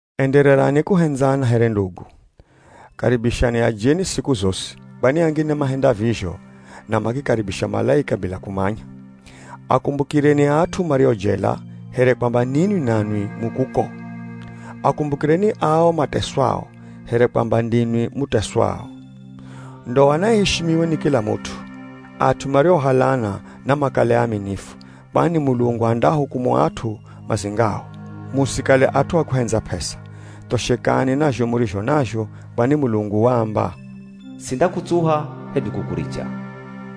Endererani kuhendzana here ndugu. Karibishani ajeni siku zosi, kwani angine mahenda vizho na makikaribisha malaika bila kumanya. Akumbukireni at'u mario jela, here kwamba ninwi nanwi mu kuko. Akumbukireni ao mateswao, here kwamba ndinwi muteswao. Ndoa naiishimiwe ni kila mut'u. At'u mariohalana namakale aaminifu, kwani Mulungu andaahukumu at'u mazingao. Musikale at'u a kuhendza p'esa. Thoshekani na zho murizho nazho, kwani Mulungu waamba, “Sindakutsuha hedu kukuricha.”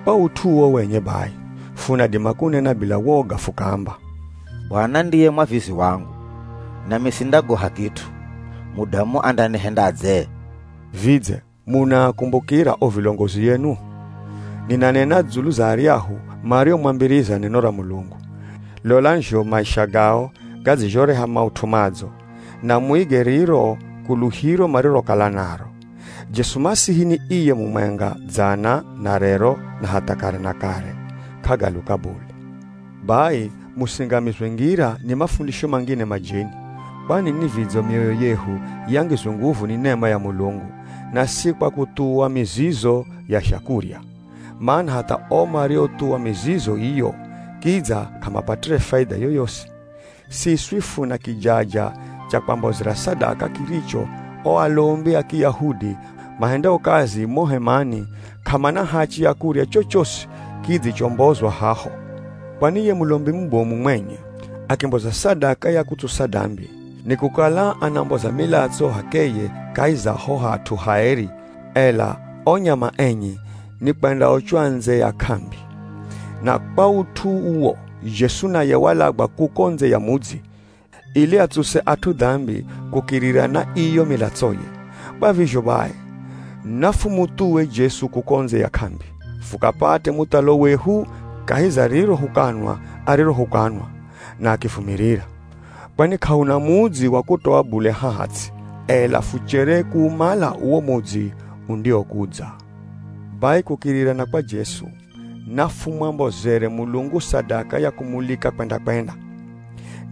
Kwa ut'u uwo wenye bai, funadima kunena bila woga fukaamba, “Bwana ndiye mwavizi wangu, Nami sindagoha kit'u, mudamu andanihendadze?” Vidze munaakumbukira o vilongozi enu? Ninanena dzulu za aryahu mariomwambiriza neno ra Mulungu. Lolani zho maisha gao gadzizhoreha maut'u madzo, na muige riro kuluhiro marirokala naro. Jesu Masihi ni iye mumwenga, dzana, na rero, na hatha kare na kare, k'agaluka bule. Bai, musingamizwe ngira ni mafundisho mangine majeni. Kwani ni vidzo mioyo yehu yangizwe nguvu ni nema ya Mulungu, na si kwa kuthuwa mizizo ya zhakurya. Mana hatha o mariothuwa mizizo iyo kidza k'amapatire faidha yoyosi. Siswi funa kijaja cha kwambozera sadaka kiricho o alombi a Kiyahudi mahendao kazi mo hemani, k'amana hachi ya kurya chochosi kidzichombozwa haho. Kwani ye mulombi mubomu mwenye akimboza sadaka ya kutsusa dambi, nikukala anamboza milatso h'akeye kahi za ho Hat'u Haeri, ela o nyama enye nikwendaochwa ndze ya k'ambi. Na kwa ut'u uwo, Jesu naye walagwa kuko ndze ya mudzi, ili atsuse at'u dambi kukirira na iyo milatsoye. Kwa vizho bai, nafumuthuwe Jesu kuko ndze ya k'ambi, fukapate muthalo wehu kahi za riro hukanwa arirohukanwa, na akivumirira. Kwani k'ahuna mudzi wa kutoa bule haha ts'i, ela fuchere kuumala uwo mudzi undiwokudza. Bai kukirira na kwa Jesu, nafumwambozere Mulungu sadaka ya kumulika kwenda-kwenda.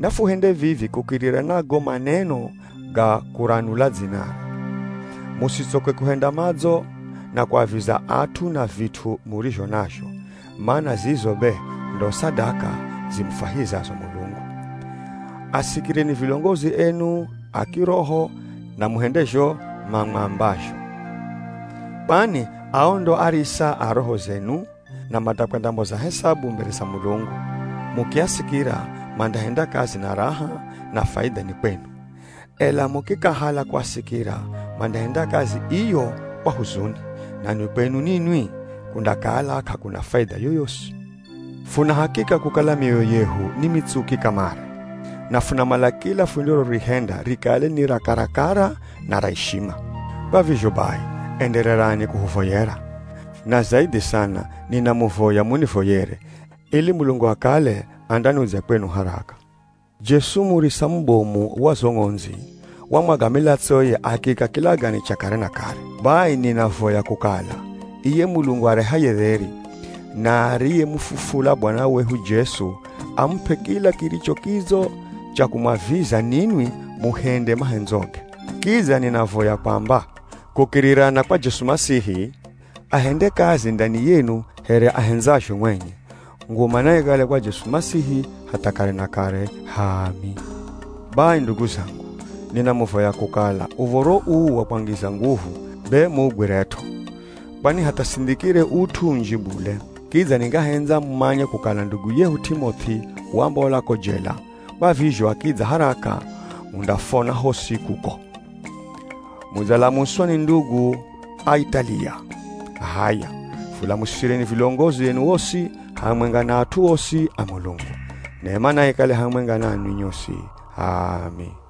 Nafuhende vivi kukirira na go maneno ga kuranula dzinare. Musitsoke kuhenda madzo, na kuaviza at'u na vit'u murizho nazho, mana zizo be ndo sadaka zimufwahizazo Mulungu. Asikireni vilongozi enu a kiroho na muhende zho mamwambazho. Kwani ao ndo arisa a roho zenu na mandakwendamboza hesabu mbere za Mulungu. Mukiasikira, mandahenda kazi na raha, na faidha ni kwenu. Ela mukikahala kuasikira, mandahenda kazi iyo kwa huzuni, nanwi kwenu ninwi kundakala k'akuna faidha yoyosi. Funa hakika kukala mioyo yehu ni mitsuki kamare, na funamala kila fundirorihenda rikale ni ra karakara na ra ishima. Kwa vizho bai, endererani kuhuvoyera. Na zaidhi sana, ninamuvoya munivoyere, ili Mulungu akale andanudzya kwenu haraka. Jesu murisa mubomu wa zo ng'ondzi, wamwaga milatsoye akiika kilagane cha kare na kare. Bai ninavoya kukala, iye Mulungu arehaye dheri, na ariyemufufula Bwana wehu Jesu, amup'e kila kiricho kidzo cha kumwaviza ninwi muhende mahendzoge. Kidza ninavoya kwamba, kukirira na kwa Jesu Masihi, ahende kazi ndani yenu here ahendzazho mwenye. Nguma naikale kwa Jesu Masihi hatha kare na kare! H'aami. Bai ndugu zangu, ninamuvoya kukala, uv̱oro uu wa kwangiza nguvu be muugwiret'o. Kwani hatha sindhikire ut'u unji bule. Kidza ningahendza mumanye kukala ndugu yehu T'imoth'i wambola ko jela, kwa vizho akidza haraka, mundafona hosi, kuko. Mudzalamuswa ni ndugu a Italiya. H'aya, fulamusireni vilongozi enu osi, hamwenga na at'u osi a Mulungu. Nema naikale hamwenga nanwi nyosi. H'aami.